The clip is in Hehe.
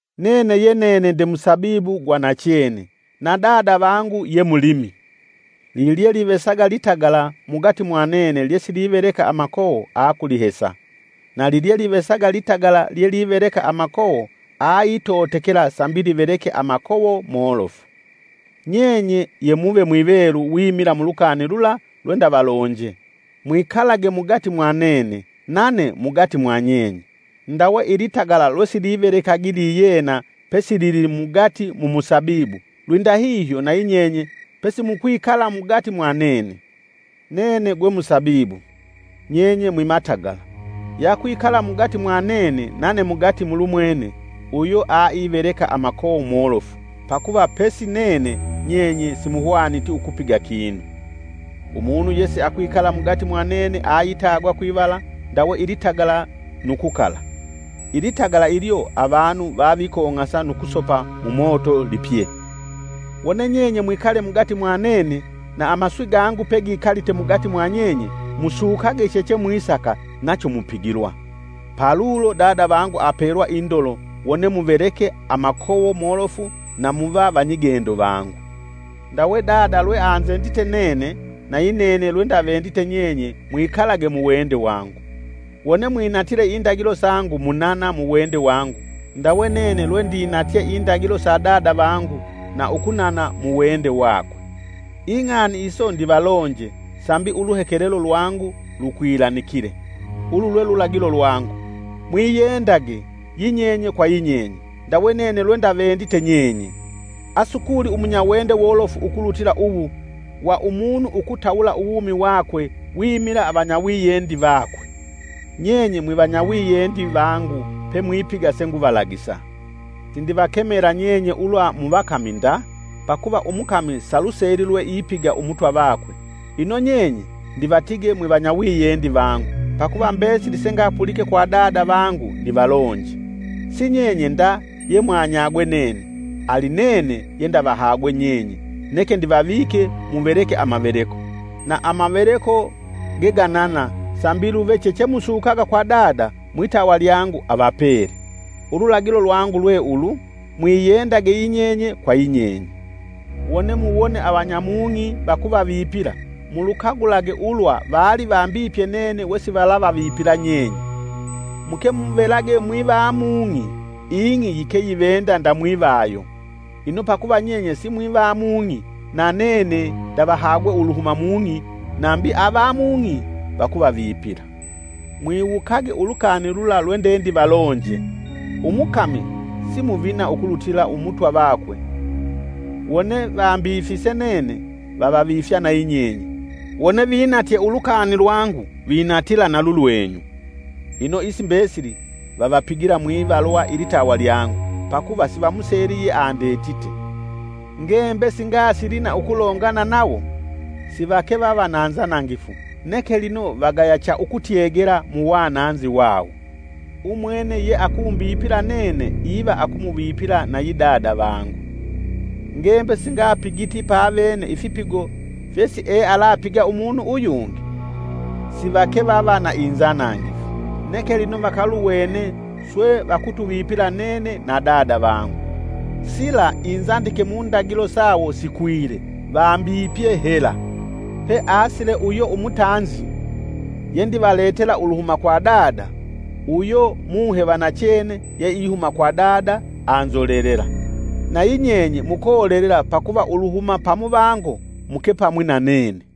“Nene yenene nde musabibu gwa nachene, na Dada vangu ye mulimi. Lilyelivesaga litagala mugati mwa nene lyesiliveleka amakowo akulihesa, na lilyelivesaga ilitagala lyeliveleka amakovo aitotekela sambi liveleke amakowo molofu. Nyenye yemuve mwivelu wimila mulukani lula lwendavalonje. Mwikalage mugati mwanene, nane mugati mwanyenye. Ndawe ilitagala lwesilivelekagi liyena pesilili mugati mumusabibu lwindahihyo nayi nyenye pesimukwikala mugati mwa nene. “Nene gwe musabibu, nyenye mwimatagala. Yakwikala mugati mwanene nane mugati mulumwene, uyo aiveleka amakowo molofu, pakuva pesi nene nyenye simuhwaniti ukupiga kinu. Umunu yesiakwikala mugati mwa nene aitagwa kwivala ndawe ilitagala nu kukala. Ilitagala ilyo avanu vavikong'asa nu kusopa mumoto lipye. Wone nyenye mwikale mugati mwanene na amaswi gangu pegikalite mugati mwanyenye musukage chechemwisaka nacho mupigilwa. Palulo Dada vangu apelwa indolo wone muveleke amakowo molofu na muva vanyigendo vangu. Ndawe Dada lweanzendite nene, nayinene lwendavendite nyenye mwikalage muwende wangu. Wone mwinatile indagilo sangu munana mu wende wangu ndawe nene lwendinatye indagilo sa Dada vangu na ukunana mu wende wakwe. Ing'ani iso ndivalonje sambi uluhekelelo lwangu lukwilanikile. Ulu lwe lulagilo lwangu: “Mwiyendage, yinyenye kwa yinyenye ndawe nene lwendavendite nyenye.” Asukuli umunyawende wolofu ukulutila uwu, wa umunu ukutawula uwumi wakwe wimila avanyawiyendi vakwe. Nyenye mwivanyawiyendi vangu pe mwipiga senguvalagisa. Sindivakemela nyenye ulwa muvakami nda, pakuva umukami saluseli lweipiga Umutwa vakwe. Ino nyenye ndivatige mwivanyawiyendi vangu, pakuva mbesili sengapulike kwa Dada vangu ndivalonje. Si Nyenye nda yemwanyagwe nene, ali nene yendavahagwe nyenye neke ndivavike muveleke amaveleko, na amaveleko geganana sambi luve chechemusukaga kwa Dada mwitawa lyangu avapele. Ululagilo lwangu lwe ulu, mwiyendage yinyenye kwa yinyenye. “Wone muwone avanyamung'i vakuvavipila, mulukagulage ulwa vali vambipye nene wesivalavavipila nyenye. Muke muvelage mwiva mung'i, ing'i yikeyivenda ndamwivayo. Ino pakuva nyenye si mwivamung'i na nene ndavahagwe uluhuma mung'i nambi avamung'i vakuvavipila. Mwiwukage ulukani lula lwendendivalonje: umukami si muvina ukulutila Umutwa vakwe. Wone vambifise nene, vavavifya na yinyenye, wone vinatye ulukani lwangu vinatila na lulwenyu. Ino isi mbesili vavapigila mwivalwa ilitawa lyangu, pakuva sivamuseli yeandetite. Ngembe singasili na ukulongana nawo, sivakevava na nzanangifu, neke lino vagaya cha ukutyegela mu wananzi wawo. Umwene yeakumbipila nene iva akumuvipila nayi Dada vangu. Ngembe singapigiti pavene ifipigo fyesiealapiga umunu uyungi, sivake vava na inzanangifu. Neke lino vakaluwene swe vakutuvipila nene na Dada vangu. Sila inzandike mundagilo sawo sikwile; ‘Vambipye hela!’ “Peasile uyo umutanzi, yendivaletela uluhuma kwa Dada, uyo Muhe va nachene yeihuma kwa Dada, anzolelela. Nayi nyenye mukolelela pakuva uluhuma pamuvango mukepamwi na nene.